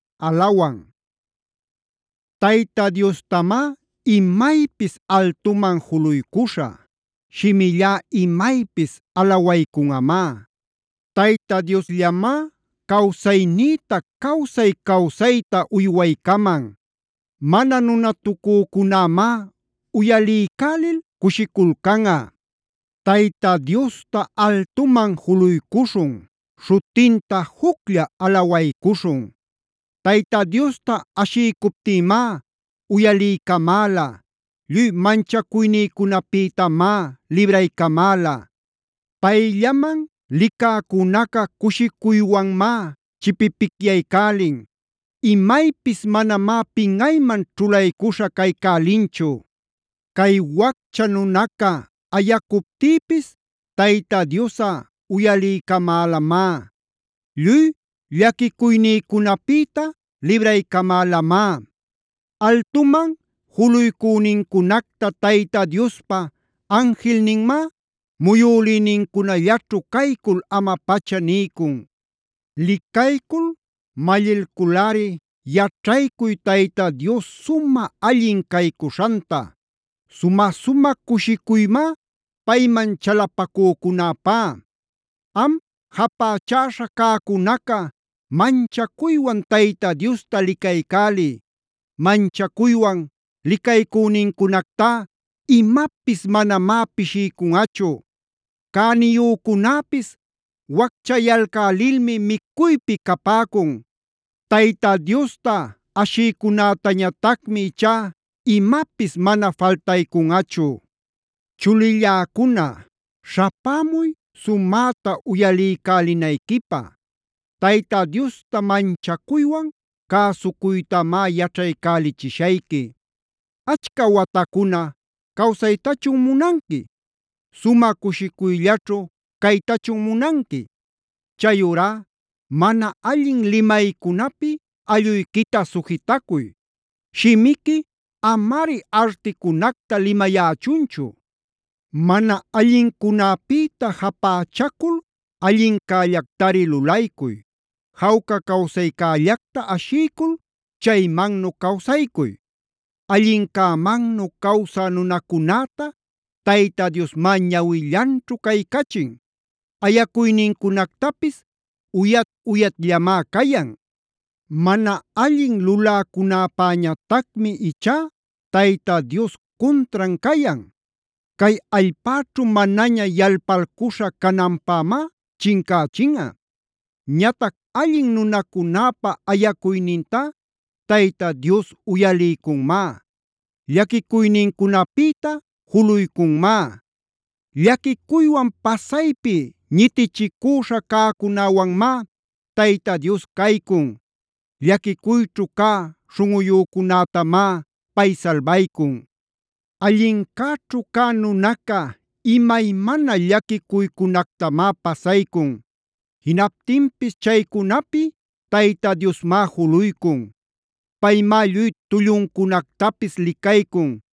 Alefb Tayta Diostamá imaypis altuman juluycuśhä; shimillá imaypis alawaycunꞌamá. Tayta Diosllamá cawsaynïta cawsay-cawsayta uywaycaman; mana nunatacücunämá uyaliycälil cushiculcanꞌa. Tayta Diosta altuman juluycuśhun; śhutinta juclla alawaycuśhun. Tayta Diosta ashiycuptïmá uyaliycamäla; lluy manchacuynïcunapïtamá libraycamäla. Payllaman licäcunaca cushicuywanmá chipipicyaycälin. Imaypis manamá pinꞌayman ćhulaycuśha caycälinchu. Cay waccha nunaca ayacuptïpis Tayta Diosꞌa uyaliycamälamá; lluy llaquicuynïcunapïta libraycamälamá. Altuman juluycünincunacta Tayta Diospa anjilninmá muyülïnincunallaćhu caycul ama-pacha niycun. Licaycul mallilculꞌari yaćhaycuy Tayta Dios sumä allin caycuśhanta.c Sumä-sumä cushicuymá payman chalapacücunäpá. Am japächaśha cäcunaca manchacuywan Tayta Diosta licaycäliy. Manchacuywan licaycünincunactá imapis manamá pishiycunꞌachu. Cäniyücunäpis wacchayalcälilmi micuypi capäcun; Tayta Diosta ashïcunätañatacmi ichá imapis mana faltaycunꞌachu. Chulilläcuna, śhapämuy sumäta uyaliycälinayquipä. Tayta Diosta manchacuywan cäsucuytamá yaćhaycälichishayqui. ¿Achca watacuna cawsaytachun munanqui? ¿Sumä cushicuyllaćhu caytachun munanqui? Chayurá mana allin limaycunapi alluyquita sujitacuy; shimiqui amari articunacta limayächunchu. Mana allincunapïta japächacul allincällactari lulaycuy. Jawca cawsaycällacta ashiycul chaymannu cawsaycuy. Allincämannu cawsä nunacunäta Tayta Diosmá ñawillanćhu caycachin; ayacuynincunactapis uyat-uyatllamá cayan. Mana allin luläcunäpäñatacmi ichá Tayta Dios cuntran cayan;d cay allpäćhu manaña yalpalcuśha cananpämá chincächinꞌa. Ñatac allin nunacunäpa ayacuynintá Tayta Dios uyaliycunmá; llaquicuynincunapïta juluycunmá. Llaquicuywan pasaypi ñitichicüśha cäcunäwanmá Tayta Dios caycun; llaquicuyćhu cä śhunꞌuyücunätamá pay salbaycun. Allincäćhu cä nunaca imaymana llaquicuycunactamá pasaycun. Jinaptinpis chaycunapi Tayta Diosmá juluycun. Paymá lluy tulluncunactapis licaycun.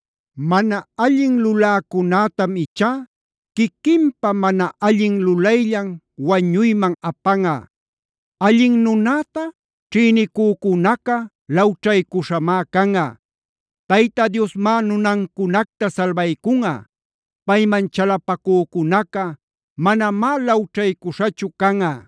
Mana allin luläcunätam ichá quiquinpa mana allin lulayllan wañuyman apanꞌa; allin nunäta ćhïnicücunaca lawćhaycuśhamá canꞌa. Tayta Diosmá nunancunacta salbaycunꞌa; payman chalapacücunaca manamá lawćhaycuśhachu canꞌa.